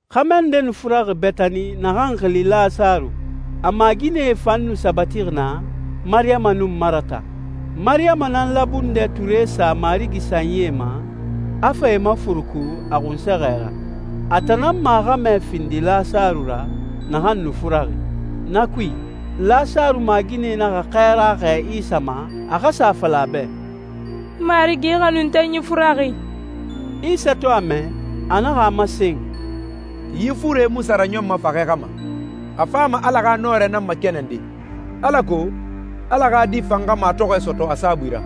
Xɛmɛ nde nu furaxi Betani naxan xili Lasaru. A maaginɛe fan nu sabatixi naa, Mariyama nun Marata. Mariyama nan labundɛ ture sa Marigi sanyie ma, a fa e mafuruku a xunsɛxɛ ra. A tan nan maaxɛmɛ findi Lasaru ra, naxan nu furaxi. Na kui, Lasaru maaginɛe naxa xɛɛra xɛɛ Isa ma, a xa sa a fala a bɛ, «Marigi, i xanuntenyi furaxi.» Isa to a mɛ, a naxa a masen, «Yi fure mu sa raɲɔnma faxɛ xa ma, a fama Ala xa nɔrɛ nan makɛnɛnde, alako Ala xa Di fan xa matɔxɔɛ sɔtɔ a saabui ra.»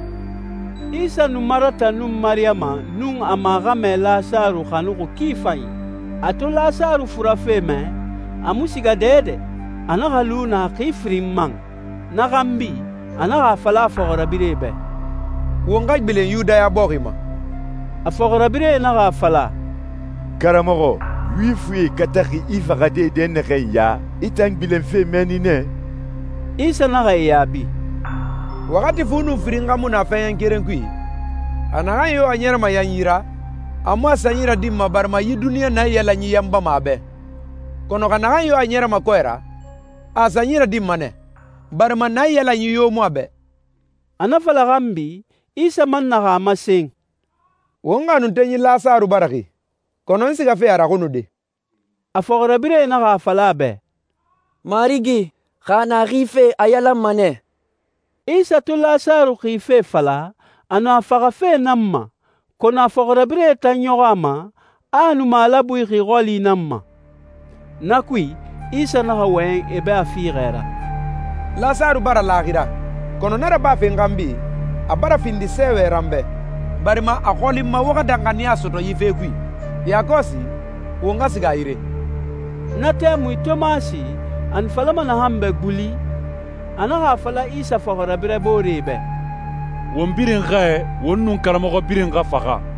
Isa nu Marata nun Mariyama nun e maaxɛmɛ Lasaru xanuxi ki fanyi. A to Lasaru furafe mɛ, a mu siga dɛdɛ, a naxa lu naa xi firin man. Na xanbi, a naxa a fala a fɔxirabirɛe bɛ, «Won xa gbilen Yudaya bɔxi ma.» A fɔxirabirɛe naxa a fala, «Karamɔxɔ, Yuwifie kataxi i faxade dɛnnaxɛ ya, i tan gbilenfe mɛnni nɛ?» Isa naxa e yaabi, «Waxati fu nun firin xa mu na fɛɛɲɛn keren kui? Xa naxan yo a ɲɛrɛma yanyi ra, a mu a sanyi radinma barima yi duniɲa naiyalanyi yanbama a bɛ. Kɔnɔ xa naxan yo a ɲɛrɛma kɔɛ ra, a a sanyi radinma nɛ, barima naiyalanyi yo mu a bɛ.» A na fala xanbi, Isa man naxa a masen, «Won xanuntenyi Lasaru bara xi, kɔnɔ n sigafe a raxunude.» A fɔxirabirɛe naxa a fala a bɛ, «Marigi, xa a na xife, a yalanma nɛ.» Isa to Lasaru xife fala, a nu a faxafe nan ma, kɔnɔ a fɔxirabirɛe tan ɲɔxɔ a ma, a a nu malabui xi xɔli nan ma. Na kui, Isa naxa wɔyɛn e bɛ a fiixɛ ra, «Lasaru bara laaxira kɔnɔ na rabafe n xanbi, a bara findi sɛɛwɛ ra n bɛ, barima a xɔli n ma wo xa danxaniya sɔtɔ yi fe kui. Yakɔsi, won xa siga a yire.» Na tɛmui Tomasi, a nu falama naxan bɛ «Guli», a naxa a fala Isa fɔxirabirɛ booree bɛ, «Won birin xɛɛ, won nun karamɔxɔ birin xa faxa!»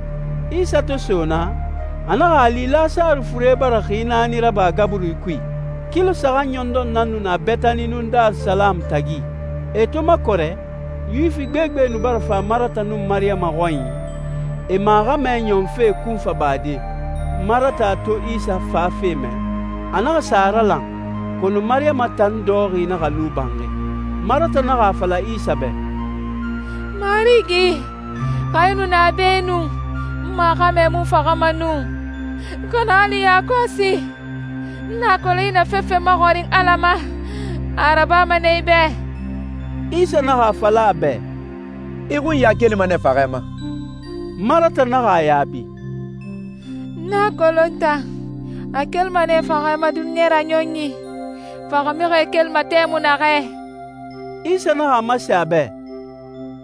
Isa to so naa, a naxa a li Lasaru fure bara xi naani raba gaburi kui. Kilo saxan ɲɔndɔn nan nu na Betani nun Darisalamu tagi. E to makɔrɛ, Yuwifi gbegbe nu bara fa Marata nun Mariyama xɔnyi, e maaxɛmɛ ɲɔnfe kunfa bade. Marata to Isa fafe mɛ, a naxa sa a ralan, kɔnɔ Mariyama tan dɔxɔxi naxa lu banxi. Marata naxa a fala Isa bɛ, «Marigi, xa i nu na be nu, n maaxɛmɛ mu faxama nu. Kɔnɔ hali yakɔsi, n a kolon a i na fefe maxɔrin Ala ma, a a rabama nɛ i bɛ.» Isa naxa a fala a bɛ, «I xunya kelima nɛ faxɛ ma.» Marata naxa a yaabi, «N a kolon tan, a kelima nɛ faxɛ ma duniɲa raɲɔnyi, faxamixie kelima tɛmui naxɛ.» Isa naxa a masen a bɛ,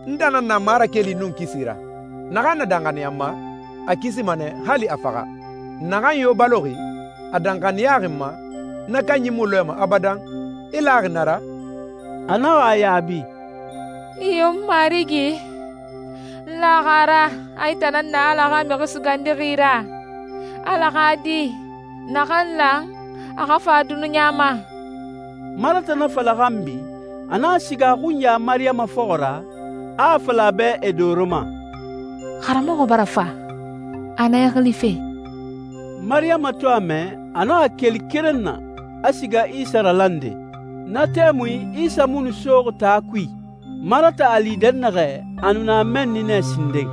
«N tan nan na marakeli nun kisi ra. Naxan na danxaniya n ma, a kisima nɛ, hali a faxa. Naxan yo baloxi, a danxaniyaxi n ma, na kanyi mu lɔɛma abadan. I laxi na ra?» A naxa a yaabi, «Iyo, Marigi! N laxi a ra a i tan nan na Ala xa Mixi Sugandixi ra, Ala xa Di, naxan lan a xa fa duniɲa ma.» Marata na fala xanbi, a naxa siga a xunya Mariyama fɔxɔ ra, a a fala a bɛ e doro ma, «Karamɔxɔ bara fa, a na i xilife.» Mariyama to a mɛ, a naxa keli keren na, a siga Isa ralande. Na tɛmui, Isa mu nu soxi taa kui. Marata a li dɛnnaxɛ, a nu na mɛnni nɛ sinden.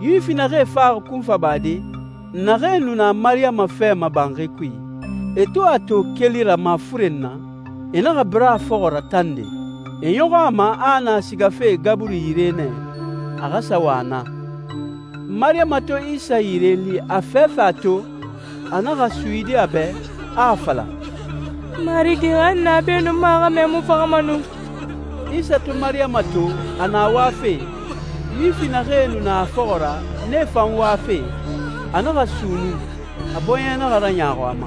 Yuwifi naxee faxi kunfa bade, naxee nu na Mariyama fɛ ma banxi kui, e to a to keli ra mafuren na, e naxa bira a fɔxɔ ra tande. E ɲɔxɔ a ma a a na sigafe gaburi yire nɛ, a xa sa wa naa. Mariyama to Isa yire li, a fɛfɛ a to, a naxa suyidi a bɛ, a a fala, «Marigi, xa i nu na be nu, n maaxɛmɛ mu faxama nu!» Isa to Mariyama to, a na wafe, Yuwifi naxee nu na a fɔxɔ ra, nee fan wafe, a naxa sunnun, a bɔɲɛ naxa raɲaaxu a ma.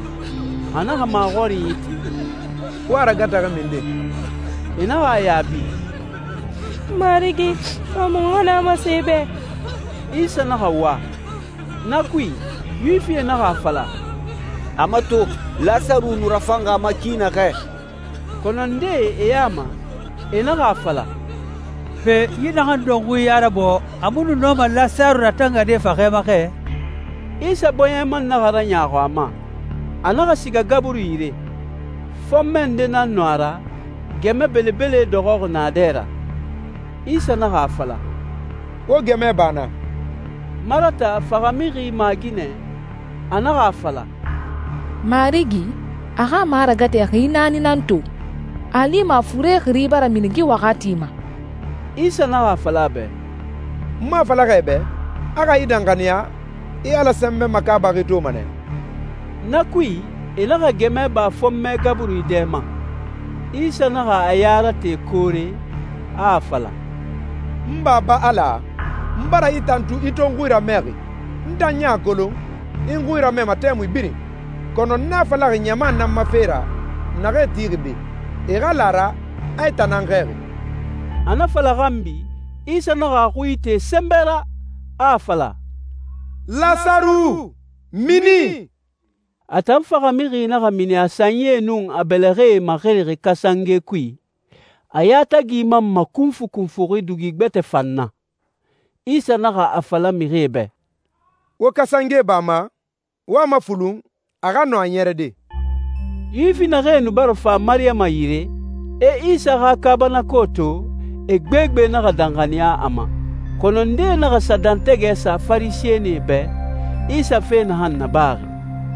A naxa maxɔrinyi ti, «Wo a ragataxi minden?» E naxa a yaabi, «Marigi, fa, muxu xa na masen i bɛ.» Isa naxa wa. Na kui, Yuwifie naxa a fala, «A mato, Lasaru nu rafanxi a ma ki naxɛ!» Kɔnɔ ndee e ya ma, e naxa a fala, «Pe, yi naxan dɔnxui ya rabɔɔ, a mu nu nɔma Lasaru ratangade faxɛ ma xɛ?» Isa bɔɲɛ man naxa raɲaaxu a ma. A naxa siga gaburi yire. Fɔnmɛ nde nan nu a ra, gɛmɛ belebele dɔxɔxi na dɛ ra. Isa naxa a fala, «Wo gɛmɛ ba naa.» Marata, faxamixi maaginɛ, a naxa a fala, «Marigi, a xa maragatɛ xi naani nan to! A a lima a fure xiri bara mini yi waxati ma.» Isa naxa a fala a bɛ, «N mu a fala xɛ i bɛ, a xa i danxaniya, i Ala sɛnbɛ makaabaxi toma nɛ?» Na kui, e naxa gɛmɛ ba fɔnmɛ gaburi dɛ ma. Isa naxa a ya rate koore, a a fala, «N Baba Ala, n bara i tantu i to n xui ramɛxi. N tan ɲan a kolon, i n xui ramɛma tɛmui birin, kɔnɔ n na falaxi ɲama nan ma fe ra naxee tixi be, e xa la a ra a i tan nan n xɛɛxi.» A na fala xanbi, Isa naxa a xui ite sɛnbɛ ra, a a fala, «Lasaru, mini!» A tan faxamixi naxa mini a sanyie nun a bɛlɛxɛe maxirixi kasange kui, a yatagi man makunfukunfuxi dugi gbɛtɛ fan na. Isa naxa a fala mixie bɛ, «Wo kasange ba a ma, wo a mafulun, a xa nɔ a ɲɛrɛde.» Yuwifi naxee nu bara fa Mariyama yire, e Isa xa kaabanako to, e gbegbe naxa danxaniya a ma. Kɔnɔ ndee naxa sa dɛntɛgɛ sa Farisɛnie bɛ, Isa fe naxan nabaxi.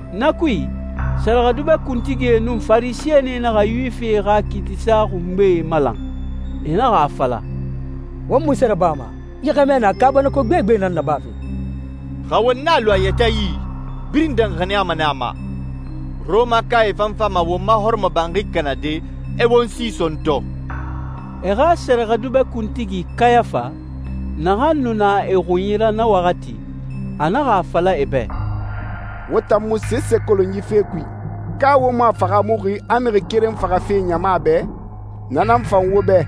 Na kui, sɛrɛxɛdubɛ kuntigie nun Farisɛnie naxa Yuwifie xa kiitisa xungbee malan. E naxa a fala, «Won munse rabama? Yi xɛmɛ na kaabanako gbegbe nan nabafe. Xa won a lu a yɛtɛ yi, birin danxaniyama nɛ a ma, Rɔmakae fan fama won ma hɔrɔmɔbanxi kanade, e won si sɔntɔ!» E xa sɛrɛxɛdubɛ kuntigi Kayafa, naxan nu na e xunyi ra na waxati, a naxa a fala e bɛ, «Wo tan mu sese kolon yi fe kui. Ka wo mu a fahaamuxi a mixi keren faxafe ɲama bɛ, na nan fan wo bɛ,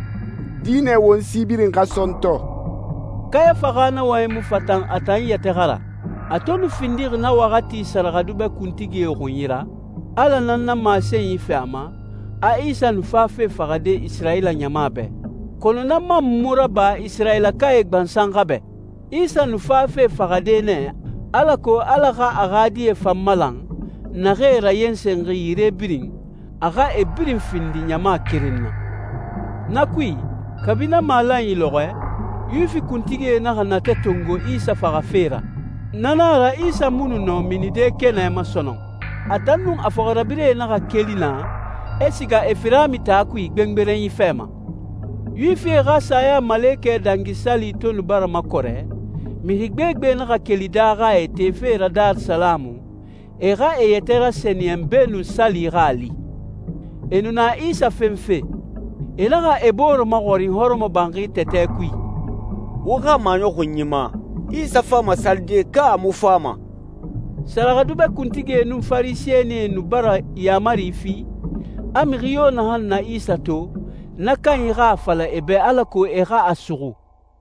dinɛ won si birin xa sɔntɔ?» Kayafa xa na wɔyɛnyi mu fatan a tan yɛtɛ xa ra. A to nu findixi na waxati sɛrɛxɛdubɛ kuntigie xunyi ra, Ala nan na masenyi fi a ma, a Isa nu fafe faxade Isirayila ɲama bɛ. Kɔnɔ na man mu raba Isirayilakae gbansan xa bɛ. Isa nu fafe faxade nɛ alako Ala xa a xa die fan malan, naxee rayensenxi yire birin, a xa e birin findi ɲama keren na. Na kui, kabi na malanyi lɔxɔɛ, Yuwifi kuntigie naxa natɛ tongo Isa faxafe ra. Na nan a ra Isa mu nɔ minide kɛnɛ ma sɔnɔn. A tan nun a fɔxirabirɛe naxa keli naa, e siga Efirami taa kui gbengberenyi fɛ ma. Yuwifie xa Sayamalekɛ Dangi Sali to nu bara makɔrɛ, mixi gbegbe naxa keli daaxae tefe ra Darisalamu, e xa e yɛtɛ rasɛniyɛn beenun sali xa a li. E nu na Isa fenfe. E naxa e bore maxɔrin hɔrɔmɔbanxi tɛtɛ kui, «Wo xa maɲɔxunyi ma, Isa fama salide, ka a mu fama?» Sɛrɛxɛdubɛ kuntigie nun Farisɛnie nu bara yaamari fi, a mixi yo naxan na Isa to, na kanyi xa a fala e bɛ alako e xa a suxu.